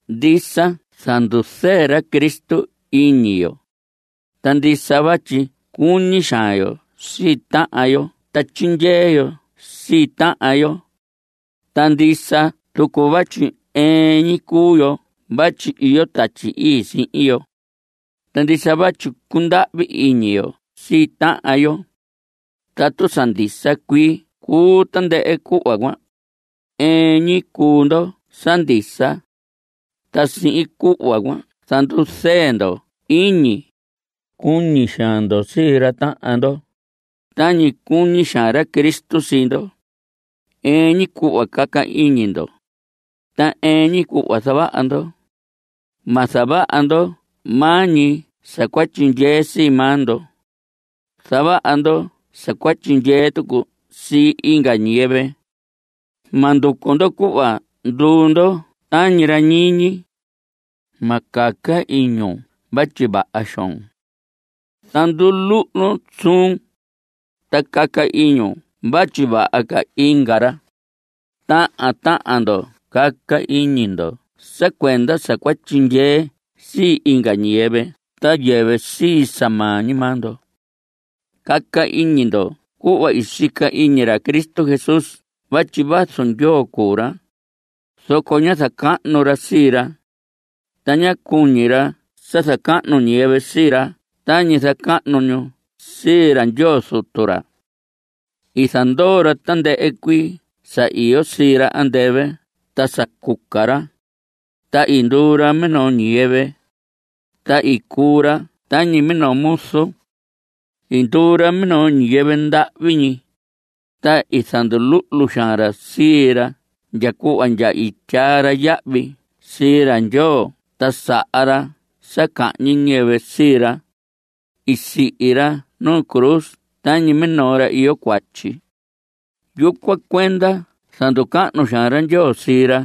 Ndisa zanduzɨɨ ra Cristo iñi yo. Ta ndisa vatyi cuñi xaan yo sii tahan yo ta tyindyee yo sii tahan yo. Ta ndisa tucu vatyi ɨɨn ñi cuu yo vatyi iyo Tatyi Ii sihin yo. Ta ndisa vatyi cundahvi iñi yo sii tahan yo. Tatu sa ndisa cuii cuu tandɨhɨ cuhva cuan, ɨɨn ñi cuu ndo sa ndisa. Ta sihin cuhva cuan zanduzɨɨ ndo iñi. Cuñi xaan ndo sii ra tahan ndo, tañi cuñi xaan ra Cristo sii ndo. Ɨɨn ñi cuhva caca iñi ndo, ta ɨɨn ñi cuhva zavaha ndo. Ma zavaha ndo maa ñi sa cua tyindyee sii maa ndo. Zavaha ndo sa cua tyindyee tucu sii inga ñiyɨvɨ. Ma nducu ndo cuhva nduu ndo tañi ra ñiñi. Ma caca iñun vatyi vaha xoon. Zanduluhlun suun, ta caca iñun vatyi vaha ca inga ra. Tahan tahan ndo caca iñi ndo sa cuenda sa cua tyindyee sii inga ñiyɨvɨ ta yɨvɨ sii sa maa ñi maa ndo. Caca iñi ndo cuhva i sica iñi ra Cristo Jesús vatyi vazu Ndyoo cuu ra, zoco ñá zacahnu ra sii ra. Ta ñá cuñi ra sa zacahnu ñiyɨvɨ sii ra tañi zacahnu ñu sii ra Ndyoo Zutu ra. I zandoo ra tandɨhɨ cuii sa iyo sii ra andɨvɨ ta sa cuca ra, ta i nduu ra minoo ñiyɨvɨ. Ta i cuu ra tañi minoo muzu. I nduu ra minoo ñiyɨvɨ ndahvi ñi, ta i zanduluhlu xaan ra sii ra ndya cuhva ndya i tyaa ra yahvi sii ra Ndyoo ta saha ra sa cahñi ñiyɨvɨ sii ra. I sihi ra nu cruz tañi minoo ra iyo cuatyi. Yucuan cuenda zanducahnu xaan ra Ndyoo sii ra,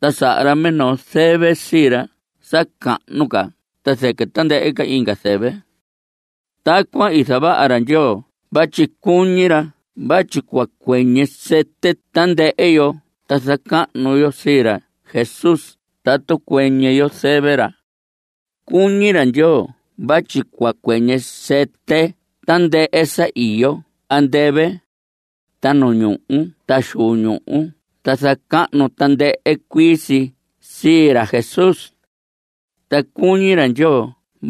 ta saha ra minoo zɨvɨ sii ra sa cahnu ca ta zɨquɨ tandɨhɨ inga zɨvɨ. Tacuan i zavaha ra Ndyoo vatyi cuñi ra vatyi cua cuɨñɨ sɨtɨ tandɨhɨ yo ta zacahnu yo sii ra Jesús tatu cuɨñɨ yo zɨvɨ ra. Cuñi ra Ndyoo vatyi cua cuɨñɨ sɨtɨ tandɨhɨ sa iyo andɨvɨ, ta nu ñuhu ta xu ñuhu ta zacahnu tandɨhɨ cuii si sii ra Jesús. Ta cuñi ra Ndyoo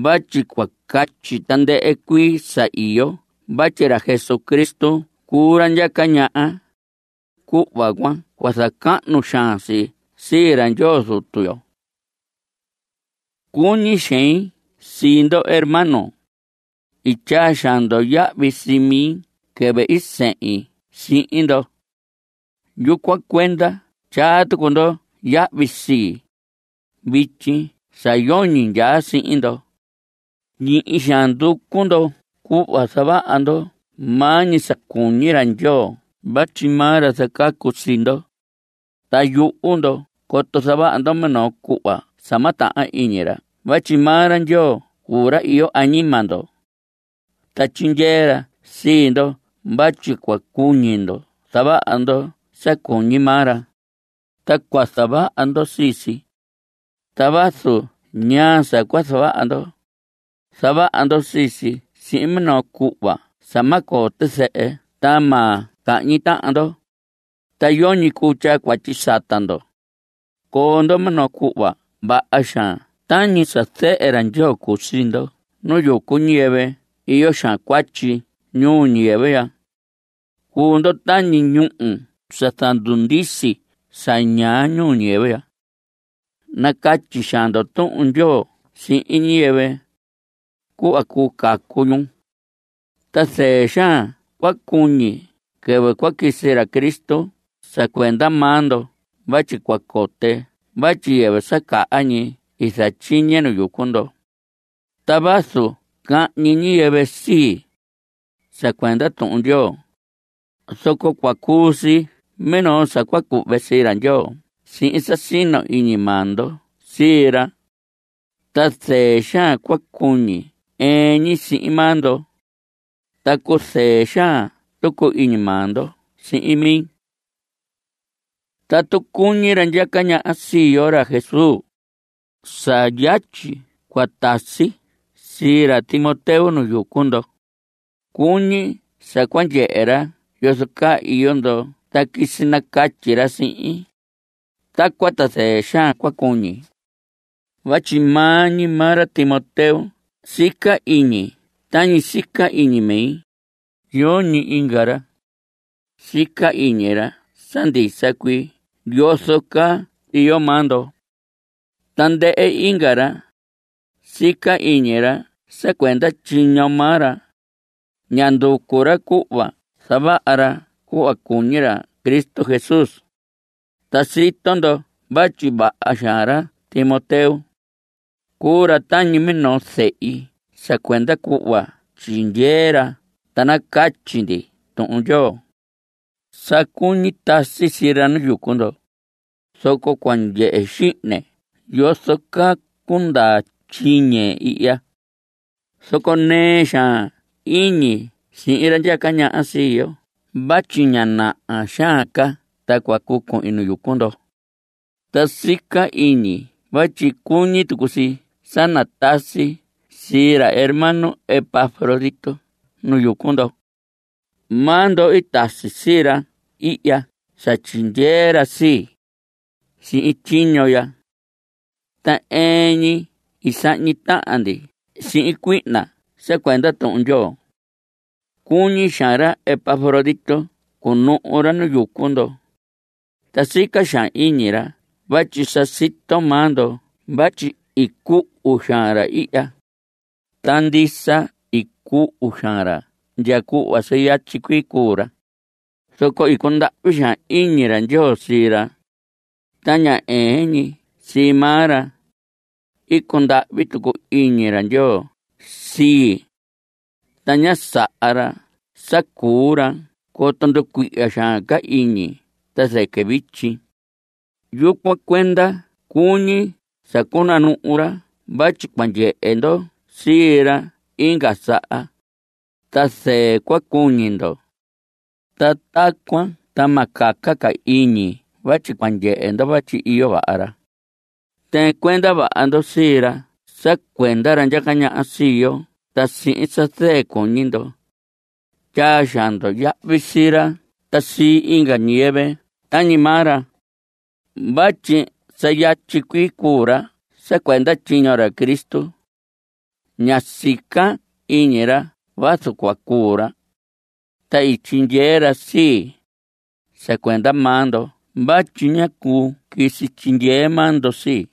vatyi cua catyi tandɨhɨ cuii sa iyo vatyi ra Jesucristo cuu ra ndyaca ñaha. Cuhva cuan cua zacahnu xaan si sii ra Ndyoo Zutu yo. Cuñi xein sii ndo hermanos. I tyaa xaan ndo yahvi sii mi quɨvɨ i sindyei sihin ndo. Yucuan cuenda tyaa tucu ndo yahvi sii, vityi sa yoñi ndyaa sihin ndo. Ñihi xaan nducu ndo cuhva zavaha ndo maa ñi sa cuñi ra Ndyoo vatyi maa ra zacacu sii ndo, ta yuhu ndo coto zavaha ndo minoo cuhva sa ma tahan iñi ra vatyi maa ra Ndyoo cuu ra iyo añima ndo. Ta tyindyee ra sii ndo vatyi cua cuñi ndo zavaha ndo sa cuñi maa ra, ta cua zavaha ndo sii si. Ta vazu ñaa sa cua zavaha ndo, zavaha ndo sii si sihin minoo cuhva sa ma coo tizɨhɨ ta ma cahñi tahan ndo, ta yoñi cuu tyaa cuatyi sata ndo. Coo ndo minoo cuhva vaha xaan tañi sa zehe ra Ndyoo cuu sii ndo nu yucu ñiyɨvɨ iyo xaan cuatyi ñuu ñiyɨvɨ ya. Cuu ndo tañi ñúhu sa zandundisi sa ñaa ñuu ñiyɨvɨ ya. Nacatyi xaan ndo Tuhun Ndyoo sihin ñiyɨvɨ, cuhva cuu cacu ñu. Ta zɨɨ xaan cua cuñi quɨvɨ quisi ra Cristo sa cuenda maa ndo vatyi cua cote vatyi yɨvɨ sa caha ñi i zatyiñe nu yucu ndo. Ta vazu cahñi ñiyɨvɨ sii, sa cuenda Tuhun Ndyoo, zoco cua cuu si minoo sa cua cuhve sii ra Ndyoo sihin sa sino iñi maa ndo sii ra. Ta zɨɨ xaan cua cuñi ɨɨn ñi sihin maa ndo. Ta cuzɨɨ xaan tucu iñi maa ndo sihin mi. Tatu cuñi ra ndyaca ñaha sii yo, ra Jesús, sa yatyi cua tasi sii ra Timoteo nu yucu ndo. Cuñi sa cua ndyehe ra yozo caa iyo ndo ta quisi nacatyi ra sihin. Tacuan ta zɨɨ xaan cua cuñi. Vatyi maa ñi maa ra Timoteo sica iñi tañi sica iñi mi, yoñi inga ra. Sica iñi ra sa ndisa cuii yozo caa iyo maa ndo. Tandɨhɨ inga ra, sica iñi ra sa cuenda tyiño maa ra. Ña nducu ra cuhva zavaha ra cuhva cuñi ra Cristo Jesús. Ta sito ndo vatyi vaha xaan ra Timoteo. Cuu ra tañi minoo zehi sa cuenda cuhva tyindyee ra ta nacatyi ndi Tuhun Ndyoo. Sa cuñi tasi sii ra nu yucu ndo, zoco cua ndyehe xihne yozo caa cundaa tyiñe ihya. Zoco nɨɨ xaan iñi sii ra ndyaca ñaha sii yo vatyi ña naha xaan ca ta cua cuu cuhin nu yucu ndo. Ta sica iñi vatyi cuñi tucu si sa natasi sii ra hermano Epafrodito nu yucu ndo. Maa ndo i tasi sii ra ihya sa tyindyee ra sii, sihin tyiño ya. Ta ɨɨn ñi i sahñi tahan ndi sihin cuihna sa cuenda Tuhun Ndyoo. Cuñi xaan ra Epafrodito cunuhu ra nu yucu ndo. Ta sica xaan iñi ra vatyi sa sito maa ndo vatyi i cuhu xaan ra ihya. Ta ndisa i cuhu xaan ra ndya cuhva sa yatyi cuii cuu ra, zoco i cundahvi xaan iñi ra Ndyoo sii ra. Ta ña ɨɨn ñi sii maa ra, i cundahvi tucu iñi ra Ndyoo sii, ta ñá saha ra sa cuu ra coto nducuihya xaan ca iñi ta zɨquɨ vityi. Yucuan cuenda cuñi sa cunanuhu ra vatyi cua ndyehe ndo sii ra inga saha, ta zɨɨ cua cuñi ndo. Ta tacuan ta ma caca ca iñi vatyi cua ndyehe ndo vatyi iyo vaha ra. Tɨɨn cuenda vaha ndo sii ra sa cuenda ra ndyaca ñaha sii yo ta sihin sa zɨɨ cuñi ndo. Tyaa xaan ndo yahvi sii ra ta sii inga ñiyɨvɨ tañi maa ra vatyi sa yatyi cuii cuu ra sa cuenda tyiño ra Cristo. Ñá sica iñi ra vazu cua cuu ra. Ta i tyindyee ra sii, sa cuenda maa ndo vatyi ñá cuu quisi tyindyee maa ndo sii.